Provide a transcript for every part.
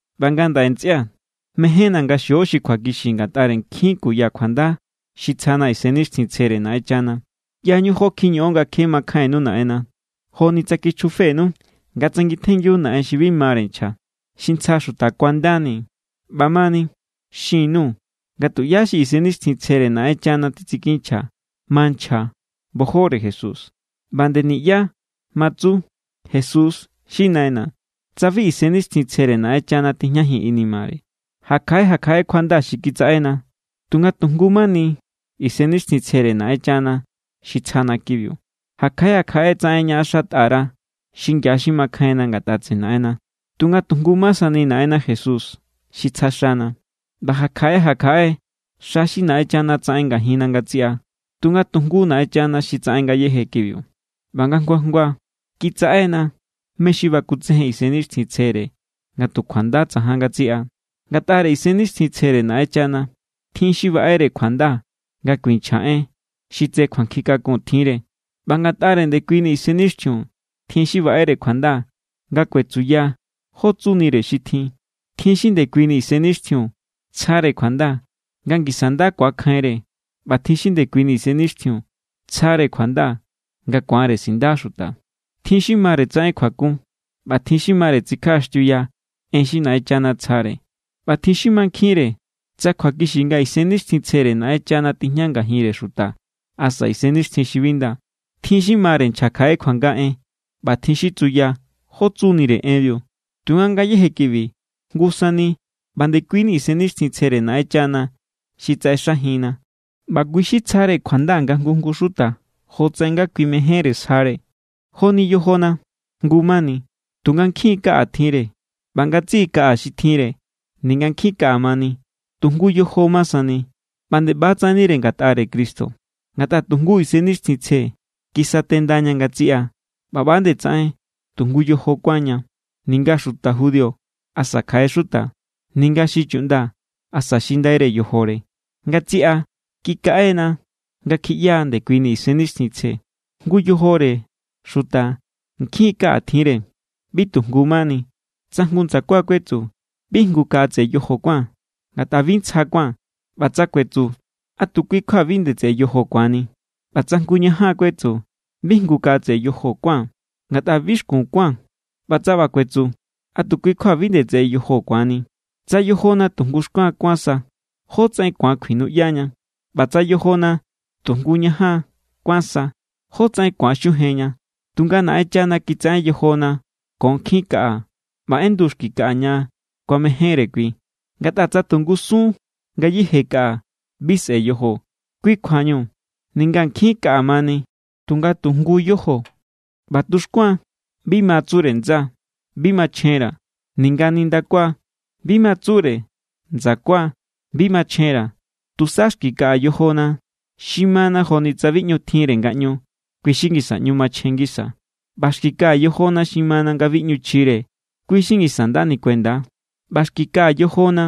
ꞌBa ngandaꞌe, ntsꞌia̱, mejénna̱ nga xio xi kjuakixi ngatꞌare nkjin kuya kjuanda xi tsjana Isennixtjintsjere Naꞌenchana. ꞌYañu jó kjiñoꞌon nga kje makjainnu Naꞌenna. Joni tsa kichjufenu nga tsangitjengiu naꞌen xi bi mare nchja, xi ntsja xuta kuandani. ꞌBamani, xin_nuu̱ nga tuꞌyá xi Isennixtjintsjere Naꞌenchana titsikinchja ma nchja bojore Jesús. ꞌBa nde niꞌyá ma tsu: “¡Jesús xi Naꞌenna!”, tsa bi Isennixtjintsjere Naꞌenchana tijñajin inimare. Ja kjaꞌe ja kjaꞌe kjuanda xi kitsaꞌena, tunga tu jngu= ma sani Isennixtjintsjere Naꞌenchana xi tsjana kibiu. Ja kjaꞌe ja kjaꞌe tsaꞌen ñaꞌaxatꞌa_ra̱ xingia xi makjainna ngatꞌa tseꞌe Naꞌenna, tunga tu jngu= ma sani Naꞌenna Jesús xi tsja xana. ꞌBa ja kjaꞌe ja kjaꞌe xa xi Naꞌenchana tsaꞌen ngajinna ngatsiꞌa, tunga tu jngu Naꞌenchana xi tsaꞌen ngayéje kibiu. ꞌBa nga jngua jngua kitsaꞌena mé= xi bakutsejen Isennixtjintsjere nga tu kjuanda tsajan ngatsiꞌa. Ngatꞌare Isennixtjintsjere Naꞌenchana, tjin xi baꞌere kjuanda nga kuinchja en xi tse kjuankjin kakun tjinre, ꞌba ngatꞌare ndekuini Isennixtjiun, tjin xi baꞌere kjuanda nga kuetsuya jó tsunire xi tjin. Tjin xi ndekuini Isennixtjiun tsjare kjuanda nga ngisa nda ku̱akjainre, ꞌba tjin xi ndekuini Isennixtjiun tsjare kjuanda nga ku̱anre sinda xuta. Tjin xi mare tsaꞌen kjuakun, ꞌba tjin xi mare tsikjaꞌaxtiuya en xi Naꞌenchana tsjare. ꞌBa tjin xi mankjinre tsa kjuakixi nga Isennixtjintsjere Naꞌenchana tijña ngajinre xuta asa isennixtjin xi bi nda. Tjin xi mare nchja kjaꞌe kjuanga en, ꞌba tjin xi tsuya jó tsunire enbiu. Tunga ngayéje kibi jngu sani ꞌba ndekuini Isennixtjintsjere Naꞌenchana xi tsaꞌexajinna, ꞌba kui xi tsjare kjuanda nga jngu jngu xuta jotsaꞌen nga Kui mejénre sjare. Joni yojona. Jngu mani, tunga nkjin= kaꞌa tjinre. ꞌBa ngatsiꞌi kaꞌa xi tjinre, ninga nkjin kaꞌa mani tu jngu yojo ma sani. ꞌBa nde ꞌba= tsaꞌennire ngatꞌare Cristo. Ngatꞌa tu jngu Isennixtjintsje kisatendaña ngatsiꞌa ꞌba ꞌba=tsaꞌen tu jngu yojo kuánña, ninga xuta judío asa kjaꞌe xuta, ninga xi chuꞌnda asa xi ndaire yojore. Ngatsiꞌa kikaꞌena nga kjiꞌyaa ndekuini Isennixtjintsje. Jngu yojore xuta nkjin= kaꞌa tjinre, bi tu jngu= mani. Tsa jngu ndsakua kuetsu: “Bi jngu kaꞌa tseꞌe yojo kuáa̱n, ngatꞌa bi ntsja kuáa̱n”, tsa ꞌba kuetsu, ¿a tu kui= kjua bi nde tseꞌe yojo ku̱anni? ꞌBa tsa jngu ñajan kuetsu: “Bi jngu kaꞌa tseꞌe yojo kuáa̱n, ngatꞌa bi xkun kuáa̱n”, tsa ꞌba kuetsu, ¿a tu kui= kjua bi nde tseꞌe yojo ku̱anni? Tsa yojona tu jngu xkuan kuán sa, ¿jótsaꞌen ku̱an kjuinuꞌyaña? ꞌBa tsa yojona tu jngu ñajan kuán sa, ¿jótsaꞌen ku̱an xujenña? Tunga Naꞌenchana kitsaꞌen yojona ko nkjin kaꞌa ꞌba ꞌendu xki kaꞌa ña kuamejénre kui. Ngatꞌa tsa tu ngusun ngayéje kaꞌa, bi sꞌe̱ yojo. Kui kjuañu ninga nkjin kaꞌa mani, tunga tu jngu= yojo. ꞌBa tuxkuan bi ma tsure ndsa: “Bi machjenra̱.” Ninga nindakua bi ma tsure ndsakua: “Bi machjenra̱.” Tusa xki kaꞌa yojona xi mana joni tsa bi ꞌñu tjinre ngaꞌñu, kui xi ngisa ꞌñu machjen ngisa. ꞌBa xki kaꞌa yojona xi mana nga bi ꞌñu chjire, kui xi ngisa nda nikuenda. ꞌBa xki kaꞌa yojona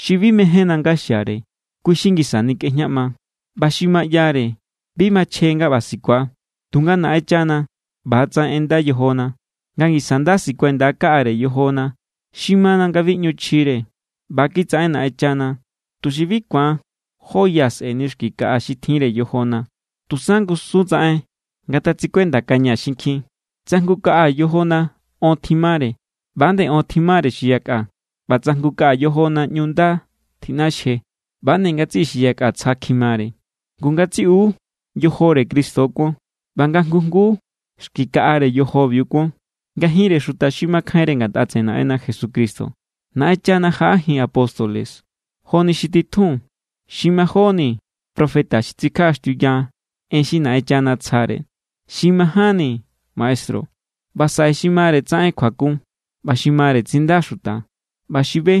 xi bi mejénna nga xiare, kui= xi ngisa nikꞌejñaꞌma. ꞌBa xi ma ꞌyare, bi machjen nga ꞌba sikua. Tunga Naꞌenchana ꞌba=tsaꞌen ꞌenda yojona, nga ngisa nda sikuenda kaꞌare yojona xi mana nga bi ꞌñu chjire. ꞌBa= kitsaꞌen Naꞌenchana, tuxi bi ku̱an jó ya sꞌe̱ni xki kaꞌa xi tjinre yojona, tusa ngusun tsaꞌen ngatsikuendakaña xinkjin. Tsa jngu kaꞌa yojona on tjimare, ꞌba=nde on tjimare xi yakꞌa. ꞌBa tsa jngu kaꞌa yojona ꞌñu nda tjiꞌnaxje, ꞌba=nde ngatsiꞌi xi yakꞌa tsja kjimare. Ngu ngatsiꞌu yojore Cristo kuon, ꞌba nga jngu jnguu xki kaꞌare yojobiu kuon. Ngajinre xuta xi makjainre ngatꞌa tseꞌe Naꞌenna Jesucristo, Naꞌenchana jaꞌajin apóstoles joni xi titjun, xi majóni profeta xi tsikjaꞌaxtiuya en xi Naꞌenchana tsjare, xi majánni maestru, ꞌba saꞌe xi mare tsaꞌen kjuakun, ꞌba xi mare tsinda xuta, ꞌba xi be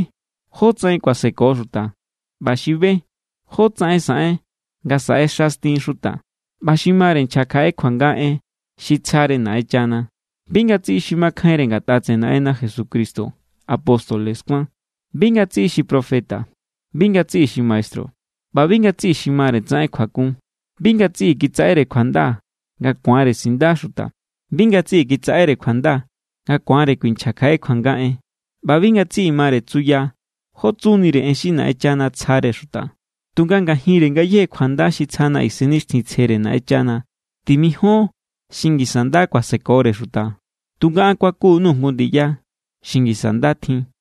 jótsaꞌen kuaseko xuta, ꞌba xi be jótsaꞌen saꞌen nga saꞌexastin xuta, ꞌba xi mare nchja kjaꞌe kjuanga en xi tsjare Naꞌenchana. Bi ngatsiꞌi xi makjainre ngatꞌa tseꞌe Naꞌenna Jesucristo apóstoles kuán, bi ngatsiꞌi xi profeta, bi ngatsiꞌi xi maestru, ꞌba bi ngatsiꞌi xi mare tsaꞌen kjuakun. Bi ngatsiꞌi kitsaꞌere kjuanda nga ku̱anre sinda xuta, bi ngatsiꞌi kitsaꞌere kjuanda nga ku̱anre kuinchja kjaꞌe kjuanga en, ꞌba bi ngatsiꞌi mare tsuya jó tsunire en xi Naꞌenchana tsjare xuta. Tunga ngajinre ngayéje kjuanda xi tsjana Isennixtjintsjere Naꞌenchana, timijon xi ngisa nda kuasekore xuta. Tunga an kuakun_nuu̱ jngu ndiya xi ngisa nda tjin.